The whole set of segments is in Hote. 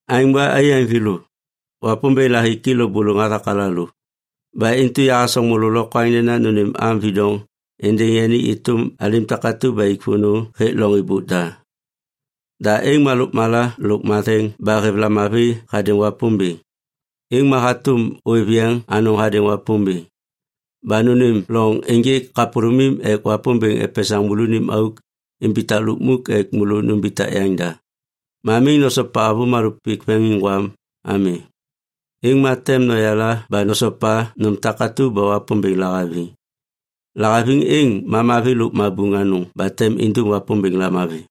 Aêŋ ba, aiyaŋ thêlô, Wapômbêŋ lahiki lôbôlôŋ hathak alalô. Ba intu yahasoŋ môlô lokwaŋ nena nônêm am vidoŋ êndêŋ yani êtôm alim takatu ba ik vônô hêk loŋ êbôk da. Da êŋ ma lôkmala lôk matheŋ ba hêv lamavi hadêŋ Wapômbêŋ. Êŋ ma hatôm ôêv yeŋ anôŋ hadêŋ Wapômbêŋ. Ba nônêm loŋ ênjêk kapôlômim ek Wapômbêŋ epesaŋ môlônim auk imbitak lukmuk ek môlô numbitak yaŋda. Ma miŋ nosopa avômalô pik veŋiŋgwam ami. Êŋ ma tem noyala ba nosopa nôm takatu ba Wapômbêŋ lahaviŋ. Lahaviŋ êŋ ma mavi lôk mabuŋ anôŋ ba tem indum Wapômbêŋ lamavi.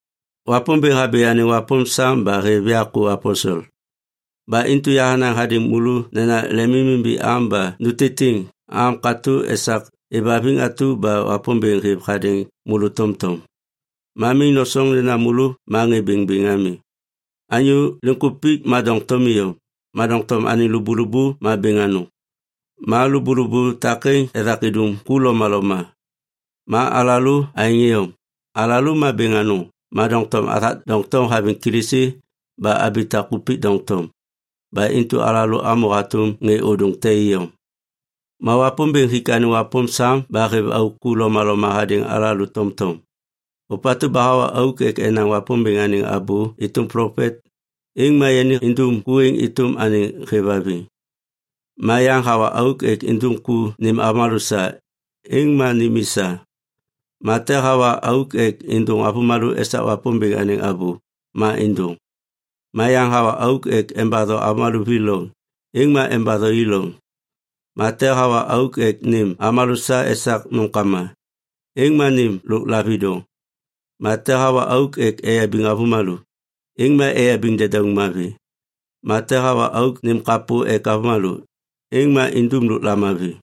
Wapômbêŋ habi anêŋ wapôm sam ba hêv ya ku aposel. Ba intu yahanaŋ hadêŋ môlô nena lemimimbi am ba nutitiŋ am katô esak êvhaviŋ atu ba Wapômbêŋ hêv hadêŋ môlô tomtom. Ma miŋ nosoŋ nena môlô ma ŋê bêŋbêŋ ami. Anyô liŋkupik ma doŋtom iyom, ma doŋtom anêŋ lôbôlôbô ma bêŋ anôŋ. Ma lôbôlôbô takêŋ ethak idum ku lomaloma. Ma alalô aêŋ iyom. Alalô ma bêŋ anôŋ ma doŋtom athak doŋtom haviŋ Kilisi ba abitak kupik doŋtom. Ba intu alalô amô hatôm ŋê ôdôŋ te iyom. Ma Wapômbêŋ hik anêŋ wapôm sam ba hêv auk ku lomaloma hadêŋ alalô tomtom. Ôpatu ba hawa auk ek enaŋ Wapômbêŋ anêŋ abô êtôm plopet, êŋ ma yani indum ku êŋ êtôm anêŋ hêvhaviŋ. Ma yaŋ hawa auk ek indum ku nêm avômalô sa, êŋ ma nêm i sa. Ma te hawa auk ek êndôŋ avômalô esak Wapômbêŋ anêŋ abô, ma êndôŋ. Ma yaŋ hawa auk ek embatho avômalô vi loŋ, êŋ ma embatho i loŋ. Ma te hawa auk ek nêm avômalô sa esak nômkama, êŋ ma nêm lôk lavidoŋ. Ma te hawa auk ek eyabiŋ avômalô, êŋ ma eyabiŋ dedauŋ mavi. Ma te hawa auk nêm kapô ek avômalô, êŋ ma indum lôk lamavi.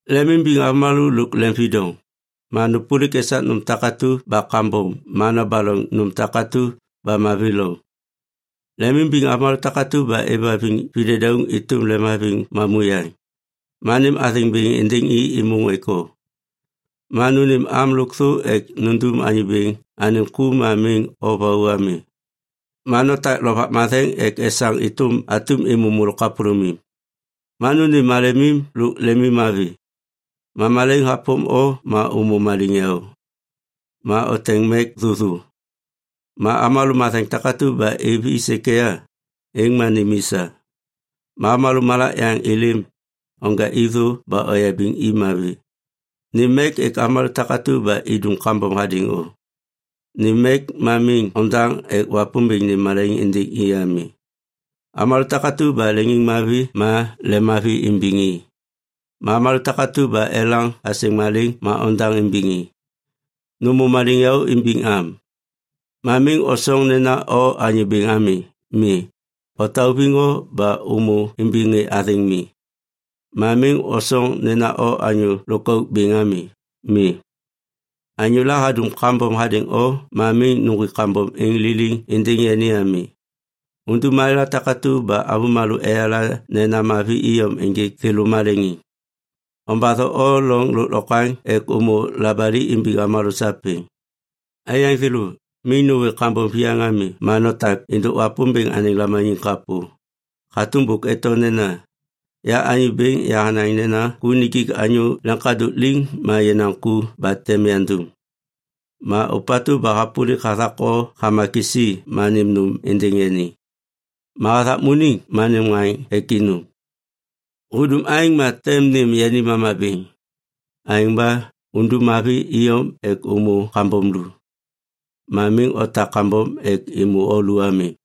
Lemimbiŋ avômalô lôk lemvidoŋ. Ma nôpôlik esak nôm takatu ba kambom ma nobaloŋ nôm takatu ba mavi loŋ. Lemimbiŋ avômalô takatu ba êvhaviŋ videdauŋ êtôm lemhaviŋ mamuyaŋ. Ma nêm athêŋ bêŋ êndêŋ i êmôŋ ek o. Ma nônêm am lôkthô ek nundum Anyô Bêŋ anêŋ ku ma miŋ o vau ami. Ma notak Lovak Matheŋ ek esaŋ êtôm atum êmô môlô kapôlômim. Ma nônêm malemim lôk lemimmavi. Ma malaiŋ hapôm o ma ômô maliŋyaô. Ma oteŋ mek thôthô. Ma avômalô matheŋ takatu ba êv i sêkêya, êŋ ma nêm i sa. Ma avômalô malak yaŋ êlêm, onja i thô ba oyabiŋ i mavi. Nêm mek ek avômalô takatu ba idum kambom hadêŋ o. Nêm mek ma miŋ ondaŋ ek Wapômbêŋ nêm malaiŋ êndêŋ i ami. Avômalô takatu ba leŋiŋmavi ma lemmavi imbiŋ i. Ma avômalô takatu ba elaŋ asêŋ malêŋ ma ondaŋ imbiŋ i. Nômô maliŋyaô imbiŋ am. Ma miŋ osoŋ nena o anyô bêŋ ami. Mi, otauviŋ o ba ômô imbiŋ ŋê athêŋ mi. Ma miŋ osoŋ nena o anyô lôkauk bêŋ ami. Mi. Anyôla hadum kambom hadêŋ o ma miŋ nuŋgwik kambom êŋ liliŋ êndêŋ yani ami. Undum malêla takatu ba avômalô eyala nena mavi iyom ênjêk thêlô maleŋiŋ. Ombatho o loŋ lôklokwaŋ ek ômô labali imbiŋ avômalô sapêŋ. Aiyaŋ thêlô, miŋ nôwê kambom viyaŋ ami ma notak êndôk Wapômbêŋ anêŋ lamaniŋ kapô. Hatôm bôk eto nena, “Ya Anyô Bêŋ yahanaŋ nena ku nijik anyô leŋkadôk liŋ ma yenaŋ ku ba tem yandum.” Ma “Ôpatu ba hapôlik hathak o hama kisi ma nêm nôm êndêŋ yani. Ma hathakmuniŋ ma nêm ŋaŋ ek inum. Hudum aêŋ ma tem nêm yani mama bêŋ.” Aêŋ ba undum mavi iyom ek ômô kambom lu, ma miŋ otak kambom ek êmô o lu ami.